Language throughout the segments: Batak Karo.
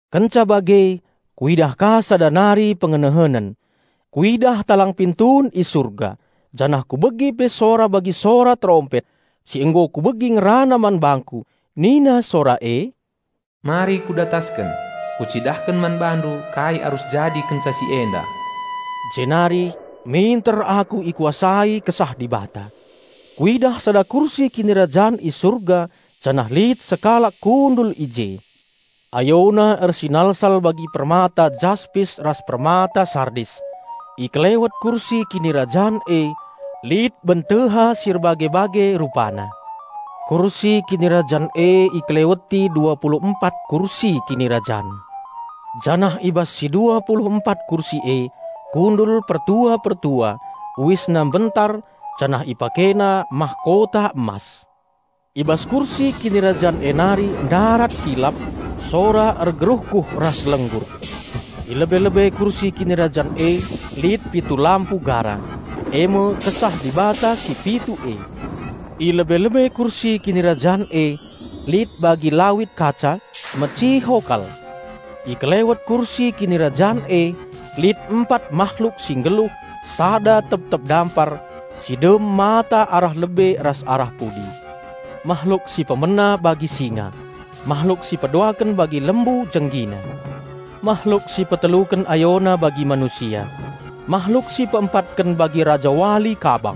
Kenca bage kuidah ka sada nari pengenehenen. Kuidah talang pintun i Surga. Janah kubegi pe sora bagi sora terompet, si nggo kubegi ngerana man bangku. Nina sora e, "Mari ku datasken; Kucidahken man bandu kai arus jadi kenca si enda." Jenari minter aku ikuasai Kesah Dibata. Kuidah sada kursi kinirajan i Surga, janah lit sekalak kundul i je. Ayona ersinalsal bagi permata Jaspis ras permata Sardis. I kelewet kursi kinirajan e lit benteha si erbage-bage rupana. Kursi kinirajan e ikeleweti dua pulu empat kursi kinirajan. Janah i bas si dua pulu empat kursi e kundul pertua-pertua, uisna mbentar janah ipakena mahkota emas. I bas kursi kinirajan e nari ndarat kilap, sora ergeruhguh ras lenggur. I lebe-lebe kursi kinirajan e lit pitu lampu gara. E me Kesah Dibata si pitu e. I lebe-lebe kursi kinirajan e lit bagi lawit kaca, meciho kal. I kelewet kursi kinirajan e lit empat mahluk si nggeluh, sada rep-tep dampar, si dem mata arah lebe ras arah pudi. Mahluk si pemena bagi singa. Mahluk si peduaken bagi lembu jenggina. Mahluk si peteluken ayona bagi manusia. Mahluk si peempatken bagi rajawali kabang.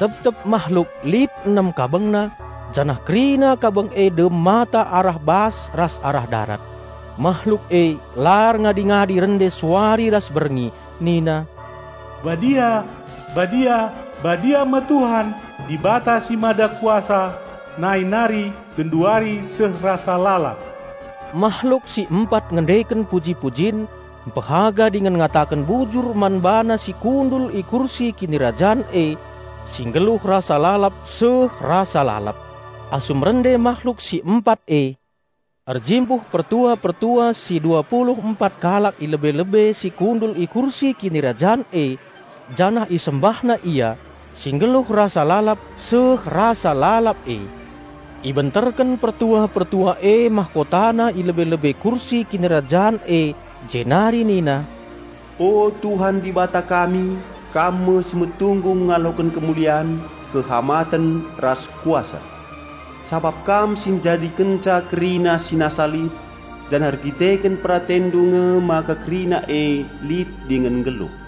Teptep mahluk lit enem kabengna janah kerina kabeng e dem mata arah bas ras arah darat. Mahluk e la erngadi-ngadi rende suari ras berngi nina, "Badia, badia, badia me Tuhan, Dibata si Mada Kuasa, nai nari, genduari seh rasa lalap." Mahluk si empat ngendeken puji-pujin, mpehaga dingen ngataken bujur man BaNa si kundul i kursi Kinirajan e, si nggeluh rasa lalap seh rasa lalap. Asum rende mahluk si empat e, erjimpuh pertua-pertua si dua pulu empat kalak i lebe-lebe si kundul i kursi Kinirajan e, janah isembahna Ia, si nggeluh rasa lalap seh rasa lalap e. Ibenterken pertua-pertua e mahkotana i lebe-lebe Kursi Kinirajan e jenari nina, "O Tuhan Dibata kami Kam me si metunggung ngaloken kemulian, kehamaten ras Kuasa. Sabap Kam njadikenca kerina si nasa lit, janah erdandanken PeratenNdu nge maka kerina e lit dingen nggeluh."